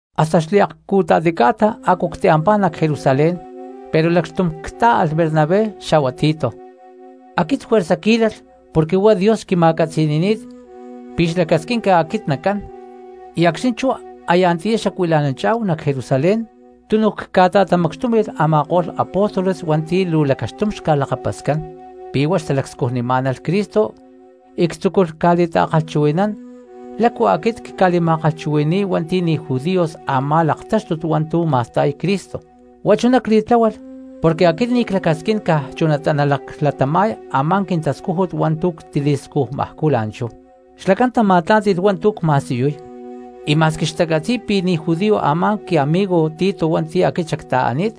Hasta xliakcu̠ta̠ti ca̠ta a̠cu ctiampá nac Jerusalén pero lacxtum cca̠tá̠alh Bernabé xa̠hua Tito. Aquit juerza cquí̠lalh porque huá Dios xquima̠catzi̠ni̠ni̠t pi̠ xlacasquín pi̠ aquit nacán; y acxni̠ chú aya antiyá xacuila̠nanchá̠hu nac Jerusalén túnuj cca̠ta̠tamacxtumí̠hu a̠ma̠ko̠lh apóstoles hua̠nti̠ luu lacaxtum xca̠lakapascán pi̠ huá xtalacscujnimá̠nalh Cristo y ctzúculh ca̠li̠ta̠kalhchuhui̠nán lácu aquit cca̠li̠ma̠kalhchuhui̠ni̠y hua̠nti̠ ni̠ judíos a̠má laktáxtut hua̠ntu̠ ma̠sta̠y Cristo. Huá chuná cli̠tláhualh porque aquit ni̠ clacasquín caj chunatá nalaclatama̠y a̠má quintascújut hua̠ntu̠ ctili̠scujmajcú la̠nchú. Xlacán tama̠tlá̠nti̠lh hua̠ntu̠ cma̠siyuy, y ma̠squi xtacatzi̠y pi̠ ni̠ judío a̠má quiamigo Tito hua̠nti̠ aquit xacta̠ani̠t,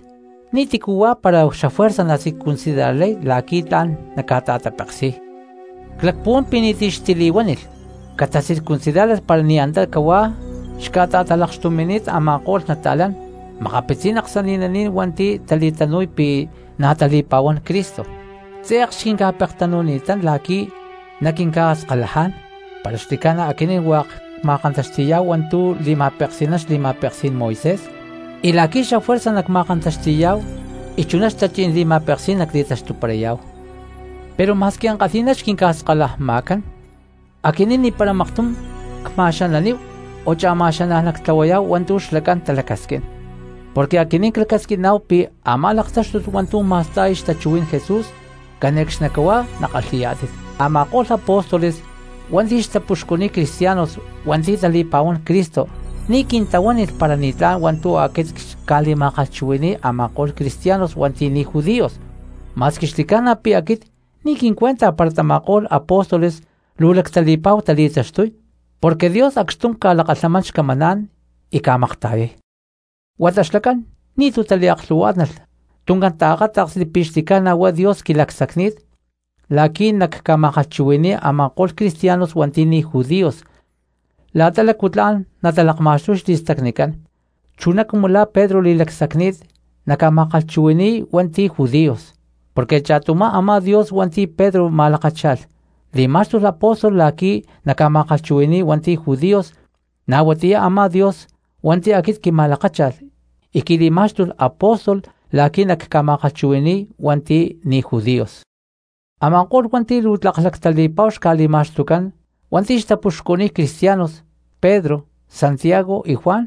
ni̠tícu huá para xafuerza nacircuncidarlay la̠qui̠ tla̠n naca̠ta̠tapeksi̠y. Cpuhuán pi̠ ni̠ti̠ xtili̠huánilh catacircuncidárlalh para ni̠ antá cahuá xca̠ta̠talakxtumi̠ni̠t a̠ma̠ko̠lh nata̠lán makapitzí̠n aksani̠naní̠n hua̠nti̠ tali̠tanu̠y pi̠ na̠ tali̠pa̠huán Cristo, tze̠k xquinca̠pektanu̠ni̠tán la̠qui̠ naquinca̠skalajá̠n para xli̠ca̠na aquinín hua̠k cma̠kantaxti̠yá̠hu hua̠ntu̠ li̠ma̠peksi̠nán xli̠ma̠peksí̠n Moisés, y la̠qui̠ xafuerza nacma̠kantaxti̠yá̠hu y chuná xtachí̠n li̠ma̠peksí̠n nacli̠taxtuparayá̠hu. Pero ma̠squi ankalhi̠ná xquinca̠skalajma̠cán, aquinín ni̠para maktum cca̠ma̠xananíhu o cha̠ma̠xanaj nactlahuayá̠hu hua̠ntu̠ xlacán talacasquín, porque aquinín clacasquiná̠hu pi̠ a̠má laktáxtut hua̠ntu̠ ma̠sta̠y xtachuhuí̠n Jesús cane̠cxnicahuá nakalhi̠yá̠tit. Ama̠ko̠lh apóstoles hua̠nti̠ xtapuxcuniy cristianos hua̠nti̠ tali̠pa̠huán Cristo ni̠ quintahuánilh para ni̠tlá̠n hua̠ntu̠ aquit cca̠li̠ma̠kalhchuhui̠ni̠y a̠ma̠ko̠lh cristianos hua̠nti̠ ni̠ judíos, ma̠squi xli̠ca̠na pi̠ aquit ni̠ quincuenta para tama̠ko̠lh apóstoles luu lactali̠pa̠hua tali̠taxtuy, porque Dios acxtum ca̠lakalhamán xcamaná̠n y ca̠makta̠yay. Huata xlacán ni̠tu̠ taliaklhu̠huá̠tnalh tuncán taakáta̠ksli pi̠ xli̠ca̠na huá Dios quili̠lacsacni̠t la̠qui̠ nacca̠ma̠kalhchuhui̠ni̠y a̠ma̠ko̠lh cristianos hua̠nti̠ ni̠ judíos la̠ta lácu tla̠n natalakma̠xtuy xli̠stacnicán, chuná cumu la̠ Pedro li̠lacsacni̠t naca̠ma̠kalhchuhui̠ni̠y hua̠nti̠ judíos. Porque cha̠tumá a̠má Dios hua̠nti̠ Pedro ma̠lakácha̠lh li̠má̠xtulh apóstol la̠qui̠ naca̠ma̠kalhchuhui̠ni̠y hua̠nti̠ judíos, na̠ huatiyá a̠má Dios hua̠nti̠ aquit quima̠lakácha̠lh y quili̠má̠xtulh apóstol la̠qui̠ nacca̠ma̠kalhchuhui̠ni̠y hua̠nti̠ ni̠ judíos. Ama̠ko̠lh hua̠nti̠ luu tlak lactali̠pa̠hu xca̠li̠ma̠xtucán hua̠nti̠ xtapuxcuniy cristianos, Pedro, Santiago y Juan,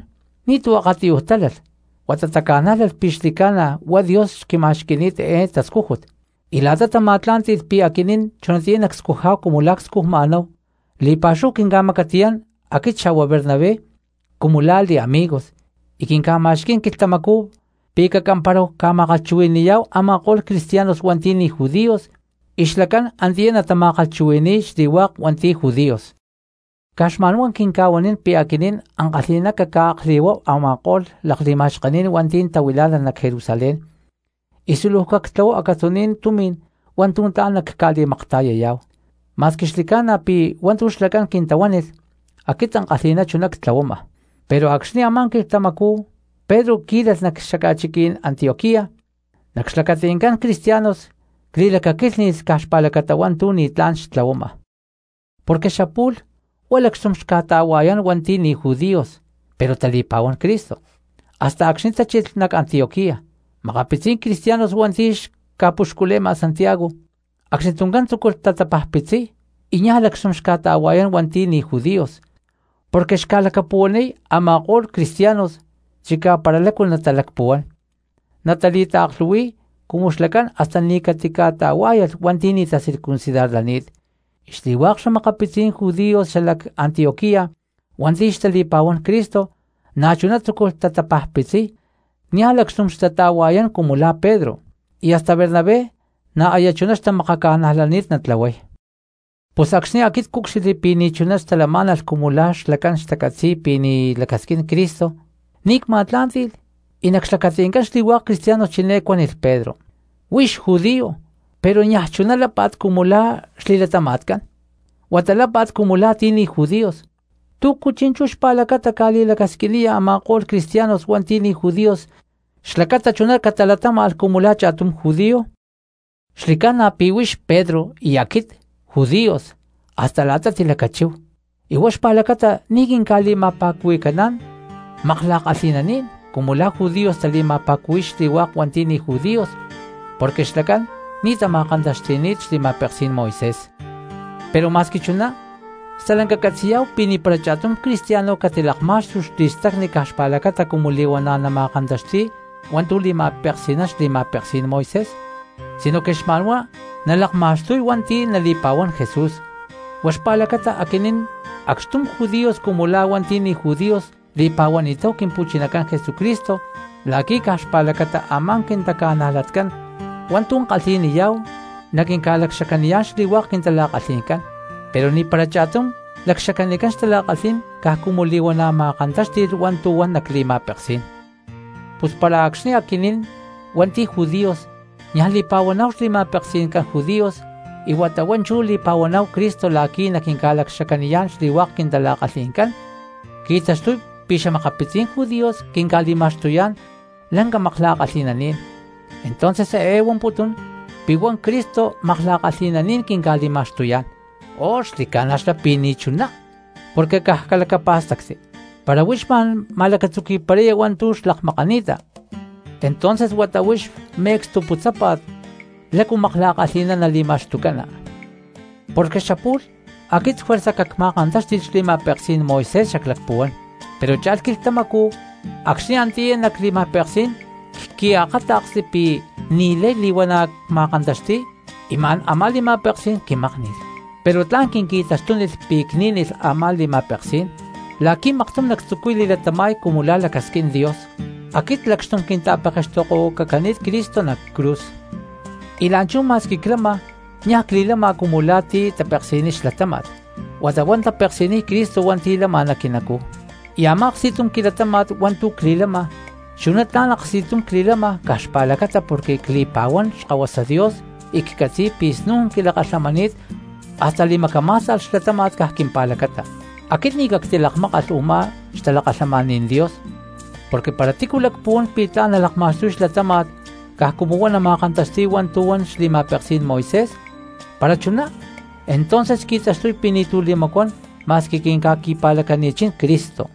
ni̠tu̠ akatiyuj tálalh, huata taca̠nájlalh pi̠ xli̠ca̠na huá Dios xquima̠xqui̠ni̠t eé tascújut. Y la̠ta tama̠tlá̠nti̠lh pi̠ aquinín chunatiyá nacscujá̠hu la̠ cscujma̠náhu, li̠pa̠xúhu quinca̠macatiyán aquit xa̠hua Bernabé cumu la̠ li̠amigos, y quinca̠ma̠xquí̠n quilhtamacú pi̠ cacamparáhu ca̠ma̠kalhchuhui̠ni̠yá̠hu a̠ma̠ko̠lh cristianos hua̠nti̠ ni̠ judíos, y xlacán antiyá natama̠kalhchuhui̠ni̠y xli̠hua̠k hua̠nti̠ judíos. Caj xma̠nhuá quinca̠huanín pi̠ aquinín ankalhi̠ná cacca̠akli̠huáhu a̠ma̠ko̠lh lakli̠ma̠xkení̠n hua̠nti̠ tahuilá̠nalh nac Jerusalén, y súluj cactlahuáhu acatzuní̠n tumi̠n hua̠ntu̠ tla̠n nacca̠li̠makta̠yayá̠hu, ma̠squi xli̠ca̠na pi̠ hua̠ntu̠ xlacán quintahuánilh aquit ankalhi̠ná chuná ctlahuama. Pero acxni̠ a̠má quilhtamacú Pedro quí̠lalh nac xaca̠chiquí̠n Antioquía, nac xlacati̠ncán cristianos cli̠lacaquílhni̠lh caj xpa̠lacata hua̠ntu̠ ni̠tlá̠n xtlahuama. Porque xapu̠lh huá lacxtum xca̠ta̠hua̠yán hua̠nti̠ ni̠ judíos pero tali̠pa̠huán Cristo, hasta acxni̠ tachilh nac Antioquía makapitzí̠n cristianos hua̠nti̠ xca̠puxcule̠ma Santiago; acxni tuncán tzúculh tapajpitziy y niaj lacxtum xca̠ta̠hua̠yán hua̠nti̠ ni̠ judíos, porque xca̠lacapuhuaniy a̠ma̠ko̠lh cristianos chicá para lácu natalacpuhuán natali̠taaklhu̠hui̠y cumu xlacán hasta ni̠ catica̠ta̠huá̠yalh hua̠nti̠ ni̠ tacircuncidarlani̠t. Y xli̠hua̠k xa̠makapitzí̠n judíos xalac Antioquía hua̠nti̠ xtali̠pa̠huán Cristo, na̠chuná tzúculh tatapajpitziy niaj lacxtum xtata̠hua̠yán cumu la̠ Pedro, y hasta Bernabé na̠ aya chuná xtamakaca̠najlani̠t natlahuay. Pus acxni̠ aquit cúcxilhli pi̠ ni̠chuná xtalamá̠nalh cumu la̠ xlacán xtacatzi̠y pi̠ ni̠ lacasquín Cristo, ni̠ cma̠tlá̠nti̠lh y nac xlacati̠ncán xli̠hua̠k cristianos chiné cuánilh Pedro: “Huix judio pero niaj chuná lápa̠t cumu la̠ xli̠latama̠tcán, huata lápa̠t cumu la̠ti̠ ni̠ judíos, ¿túcu chi̠nchú xpa̠lacata ca̠li̠lacasquiniya a̠ma̠ko̠lh cristianos hua̠nti̠ ni̠ judíos xlacata chuná catalatáma̠lh cumu la̠ cha̠tum judío?” Xli̠ca̠na pi̠ huix Pedro y aquit judíos hasta la̠ta tilacachíhu y huá xpa̠lacata ni̠ quinca̠li̠ma̠pa̠cuhui̠cán “makla̠kalhi̠nani̠n” cumu la̠ judíos tali̠ma̠pa̠cuhui̠y xli̠hua̠k hua̠nti̠ ni̠ judíos porque xlacán ni̠ tama̠kantaxti̠ni̠t xli̠ma̠peksí̠n Moisés. Pero ma̠squi chuná stalanca catzi̠yá̠hu pi̠ ni̠para cha̠tum cristiano catilakmá̠xtulh xli̠stacni caj xpa̠lacata cumu li̠huana̠ nama̠kantaxti̠y hua̠ntu̠ li̠ma̠peksi̠nán xli̠ma̠peksí̠n Moisés, sinoque xma̠nhuá nalaktaxtuy hua̠nti̠ nali̠pa̠huán Jesús. Huá xpa̠lacata aquinín acxtum judíos cumu la̠ hua̠nti̠ ni̠ judíos li̠pa̠huani̠táhu Quimpu̠chinacán Jesucristo la̠qui̠ caj xpa̠lacata a̠má quintaca̠najlatcán hua̠ntu̠ kalhi̠niyá̠hu naquinca̠lacxacaniyá̠n xli̠hua̠k quintala̠kalhi̠ncán; pero ni̠para cha̠tum lacxacanicán xtala̠kalhí̠n caj cumu li̠huana̠ ma̠kantáxti̠lh hua̠ntu̠ huan nac li̠ma̠peksí̠n. Pus para acxni̠ aquinín hua̠nti̠ judíos niaj li̠pa̠huaná̠hu xli̠ma̠peksi̠ncán judíos y huata huá chú li̠pa̠huaná̠hu Cristo la̠qui̠ naquinca̠lacxacaniyá̠n xli̠hua̠k quintala̠kalhi̠ncán, qui̠taxtuy pi̠ xa̠makapitzí̠n judíos quinca̠li̠ma̠xtuyá̠n lanca makla̠kalhi̠naní̠n, ¿entonces eé huamputún pi̠ huá Cristo makla̠kalhi̠naní̠n quinca̠tlahuayá̠n? ¡Oh, xli̠ca̠na xlá pi̠ ni̠chuná! Porque caj calacapá̠stacti, para huix ma̠n ma̠lacatzuqui̠paraya hua̠ntu̠ xlakmakani̠ta, entonces huata huix me̠cstu putzápa̠t la̠cu makla̠kalhi̠ná nali̠ma̠xtucana. Porque xapu̠lh aquit juerza cacma̠kantáxti̠lh xli̠ma̠peksí̠n Moisés xaclacpuhuán, pero cha̠lh quilhtamacú acxni̠ antiyá nac li̠ma̠peksí̠n cqui̠akáta̠ksli pi̠ ni̠lay li̠huana̠ cma̠kantaxti̠y y ma̠n a̠má li̠ma̠peksí̠n quimákni̠lh. Pero tla̠n quinqui̠taxtúnilh pi̠ cní̠nilh a̠má li̠ma̠peksí̠n la̠qui̠ maktum nactzucuy li̠latama̠y cumu la̠ lacasquín Dios. Aquit lacxtum quinta̠pekextokohuacacani̠t Cristo nac cruz, y la̠nchú ma̠squi clama niaj cli̠lama cumu la̠ ti̠ tapeksi̠niy xlatáma̠t, huata huá tapeksi̠niy Cristo hua̠nti̠ lama nac quinacú; y a̠má aksti̠tum quilatáma̠t hua̠ntu̠ cli̠lama chuná tla̠n aksti̠tum cli̠lama caj xpa̠lacata porque cli̠pa̠huán Xkahuasa Dios y ccatzi̠y pi̠ snu̠n quilakalhamani̠t hasta li̠macamá̠sta̠lh xlatáma̠t caj quimpa̠lacata. Aquit ni̠ cactilakmákalh u̠má xtalakalhamaní̠n Dios, porque para tícu lacpuhuán pi̠ tla̠n nalakma̠xtuy xlatáma̠t caj cumu huá nama̠kantaxti̠y hua̠ntu̠ huan xli̠ma̠peksí̠n Moisés, para chuná entonces qui̠taxtuy pi̠ ni̠tu̠ li̠macuán ma̠squi quinca̠qui̠pa̠lacani̠chín Cristo.